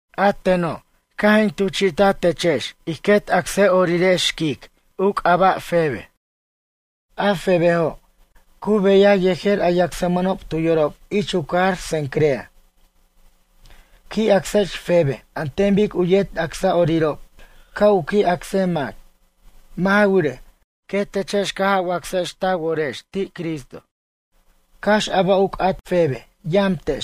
A teno', caj in tuchi'taj techex ij quet acsa'orirex u c'aba' Febe, xquic. A Febejo', cu beya yejer a yacsmʌnob tu yorob ich u cajar Cencrea. Qui' acsex Febe an ten bic u yet acsa'orirob ca' u qui' acsej mac. Mʌ' ja wirej, quetechex caj a wacsex ta worex ti' Cristo. Cax a ba' u c'at Febe, yamtex,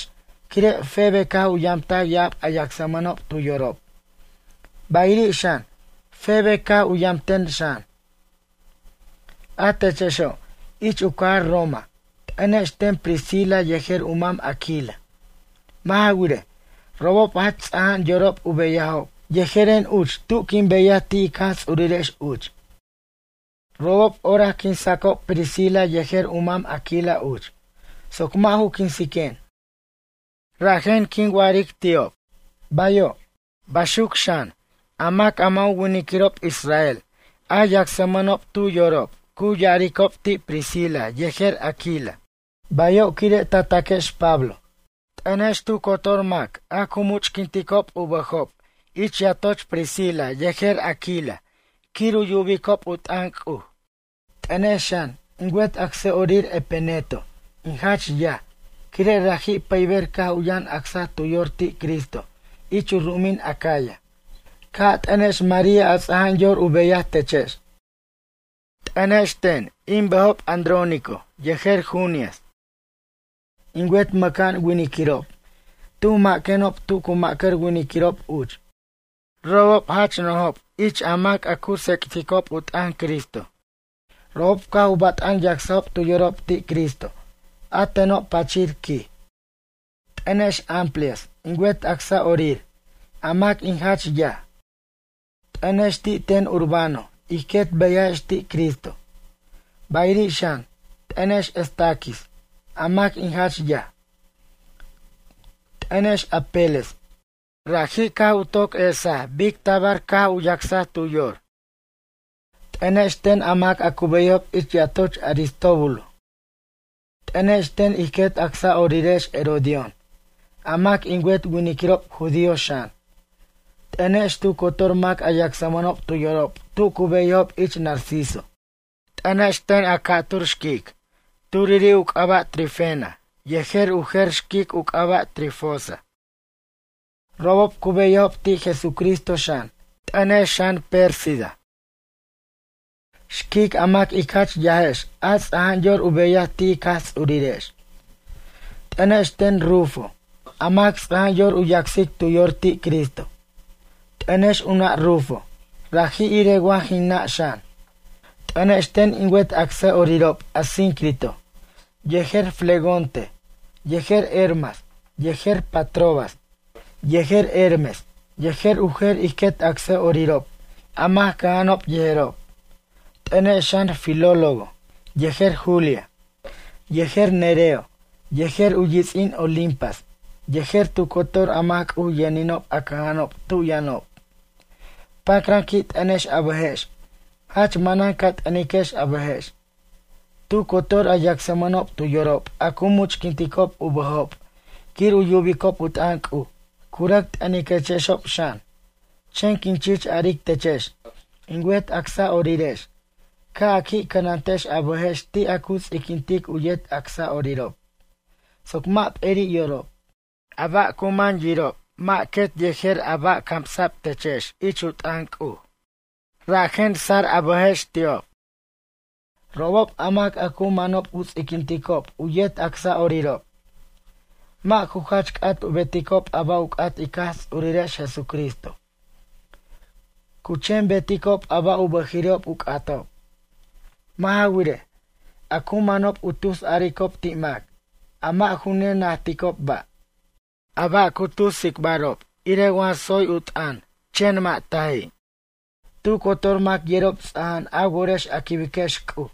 quire' Febe caj u yamtaj ya'ab a yacsmʌnob tu yorob, bayiri' xan, Febe caj u yamten xan. A techexo', ich u cajar Roma, t'ʌnex ten Priscila yejer u mam Aquila. Mʌ' ja wirej, robob jach ts'aja'an yorob u beyajob yejeren uch tu quin beyaj ti' ic Jaj Ts'urirex uch. Robob orac quinsacob Priscila yejer u mam Aquila uch, soc mʌ' ju quinsiquen. Rajen quin wa'aric ti'ob: “Bayo'.” Baxuc xan, a mac a mʌ' ju winiquirob israel, a yacsmʌnob tu yorob cu ya'aricob ti' Priscila yejer Aquila: “Bayo quire' tacaquex Pablo.” T'ʌnex tu cotor mac a cu much'quinticob u bʌjob ich yatoch Priscila yejer Aquila quir u yubicob u t'ʌn C'uj. T'ʌnex xan, in wet acsa'orir Epeneto, in jach yaj, quire' raji' pʌyber caj u yʌn acsaj tu yor ti' Cristo ich u ru'umin Acaya. Ca' a t'ʌnex María a ts'aja'an yor u beyaj techex. T'ʌnex ten, in bʌjob Adrónico yejer Junias in wet mʌ'ca'an winiquirob, tuj maquenob tu cu mʌ'car winiquirob uch. Robob jach nojob ich a mac a cu tsec'ticob u t'ʌn Cristo. Robob caj u bat'an yacsajob tu yorob ti' Cristo, a teno' pachir, quij. T'ʌnex Amplias, in wet acsa'orir, a mac in jach yaj. T'ʌnex ti' ten Urbano ij quet beyajex ti' Cristo. Bayiri' xan, t'ʌnex Estaquis, a mac in jach yaj. T'ʌnex Apeles, raji' caj u toc yesaj bic tabar taj caj u yacsaj tu yor. T'ʌnex ten a mac a cu beyajob ich yatoch Aristóbulo. T'ʌnex ten ij quet acsa'orirex Herodión, a mac in wet winiquirob judío xan. T'ʌnex, tu cotor mac a yacsmʌnob tu yorob tu cu beyajob ich Narciso. T'ʌnex ten a ca'tur xquic. Turiri' u c'aba' Trifena yejer u jer xquic u c'aba' Trifosa. Robob cu beyajob ti' Jesucristo xan. T'ʌnex xan, Pérsida, xquic a mac ic jach yajex a ts'aja'an yor u beyaj ti' ic Jaj Ts'urirex. T'ʌnex ten Rufo, a mac ts'aja'an yor u yacsic tu yor ti' Cristo. T'ʌnex u nʌ' Rufo, raji' irej wa jin nʌ' xan. T'ʌnex ten in wet acsa'orirob, Asíncrito yejer Flegonte, yejer Hermas, yejer Patrobas, yejer Hermes, yejer u jer ij quet acsa'orirob, a mac cʌja'anob yejerob. T'ʌnex xan, Filólogo yejer Julia, yejer Nereo, yejer u yits'in Olimpas, yejer tu cotor a mac C'uj yʌninob a cʌja'anob tu yʌnob. Pacran qui' t'ʌnex a bʌjex, jach manan ca t'ʌniquex a bʌjex. Tu cotor a yacsmʌnob tu yorob a cu muchquinticob u bʌjob quir u yubicob u t'ʌn C'uj, cu rʌc t'ʌniquexob xan. Chen quin chich aric techex, in wet acsa'orirex, ca' a qui' cʌnantex a bʌjex ti' a cu ts'iquintic u yet acsa'orirob, soc mʌ' p'eri' yorob. A ba' cu man yirob mʌ' quet yejer a ba' camsa'b techex ich u t'ʌn C'uj. Rajen tsar a bʌjex ti'ob. Robob, a mac a cu manob u ts'iquinticob u yet acsa'orirob, mʌ' ju jach c'at u beticob a ba' u c'at ic Jaj Ts'urirex Jesucristo. Cu chen beticob a ba' u bʌjiri'ob u c'atob. Mʌ' ja wirej, a cu manob u tus aricob ti' mac, a mʌ' ju ne najticob ba'. A ba' cu tus tsicbarob irej wa tsoy u t'ʌn, chen mʌ' taji'. Tu cotor mac yerob ts'aja'an a worex a quibiquex C'uj,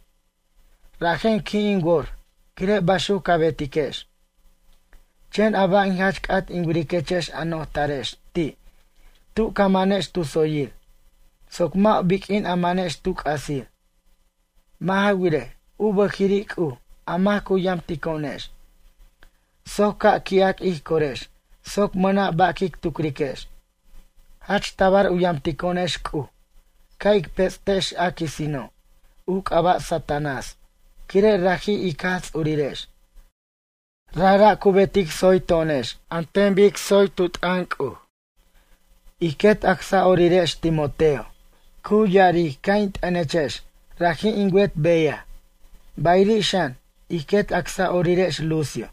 rajen qui' in wor, quire' baxuc ca betiquex. Chen a ba' in jach c'at in wiriquechex a nojtarex ti', tu ca manex tu tsoyir, soc mʌ' biq'uin a manex tu c'asir. Mʌ' ja wirej, u bʌjiri' C'uj, a mac cu yamtico'onex, soc ca' qui'ac ij corex, soc mʌna' ba' quic tucriquex. Jach tabar u yamtico'onex C'uj, ca' ic pets' tex a quisino', u c'aba' Satanás, quire' raji', ic Jaj Ts'urirex, rajra' cu betic tsoy to'onex an ten bic tsoy tu t'ʌn C'uj. Ij quet acsa'orirex Timoteo, cu ya'aric ca' in t'ʌnechex, raji' in wet beyaj. Bayiri' xan, ij quet acsa'orirex Lucio,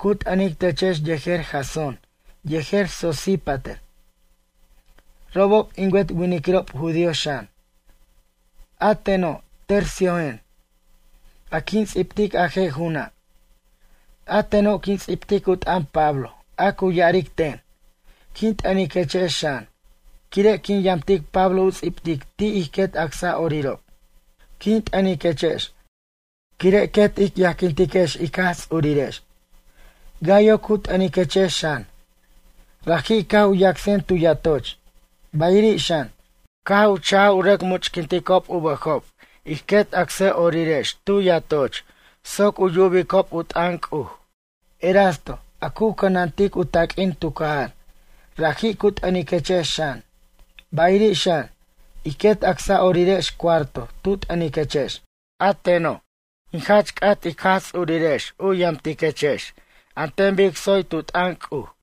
cu t'ʌnic techex yejer Jasón yejer Sosípater. Robob in wet winiquirob judío xan. A teno', Terciojen, a quin ts'ibtic a je' ju'una'. A teno' quin ts'ibtic u t'ʌn Pablo a cu ya'aric ten. Quin t'ʌniquechex xan, quire' quin yamtic Pablo u ts'ibtic ti' ij quet acsa'orirob. Quin t'ʌniquechex, quire' quet ic yajquintiquex ic Jaj Ts'urirex. Gayo cu t'ʌniquechex xan. Raji' caj u yacsajen tu yatoch, bayiri' xan, caj u cha'j u rʌc much'quinticob u bʌjob ij quet acsa'orirex tu yatoch soc u yubicob u t'ʌn C'uj. Erasto, a cu cʌnantic u taq'uin tu cajar, raji' cu t'ʌniquechex xan. Bayiri' xan, ij quet acsa'orirex Cuarto tu t'ʌniquechex. A teno', in jach c'at ic Jaj Ts'urirex u yamtiquechex an ten bic tsoy tu t'ʌn C'uj.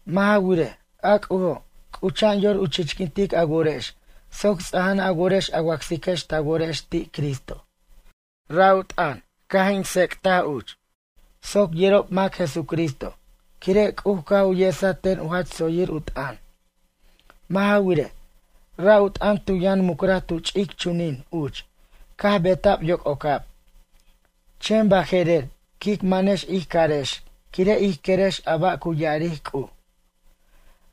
Mʌ' ja wirej, a C'ujo', c'ucha'an yor u chichquintic a worex soc ts'aja'an a worex a wacsiquex ta worex ti' Cristo. Ra' u t'ʌn, caj in tsec'taj uch, soc yerob mac Jesucristo, quire' C'uj caj u yesaj ten u jach tsoyir u t'ʌn. Mʌ' ja wirej, ra' u t'ʌn tu yʌn mucraj tu ch'ic chunin uch, caj beta'b yoc'ocab, chen baje'rer quic manex ij carex quire' ij querex a ba' cu ya'aric C'uj.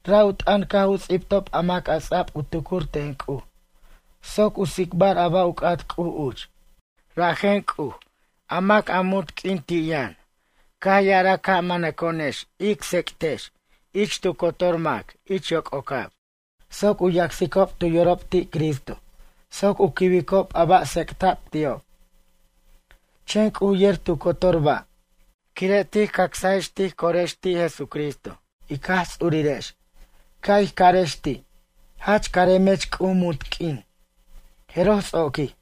Ra' u t'ʌn caj u ts'ibtob a mac a ts'a'b u tucur ten C'uj soc u tsicbar a ba' u c'at C'uj uch. Rajen C'uj, a mac munt q'uin ti' yʌn, caj ya'araj ca' manʌco'onex ic tsec'tex u t'ʌn ich mac tu cotor ich yoc'ocab, soc u yacsicob tu yorob ti' Cristo, soc u quibicob a ba' tsec'ta'b ti'ob. Chen C'uj yer tu cotor ba'. Quire' tij cacsajex tij corex ti' Jesucristo, ic Jaj Ts'urirex, ca' ij carex ti': “Jach caremech C'uj munt q'uin.” Jeroj, ts'oquij.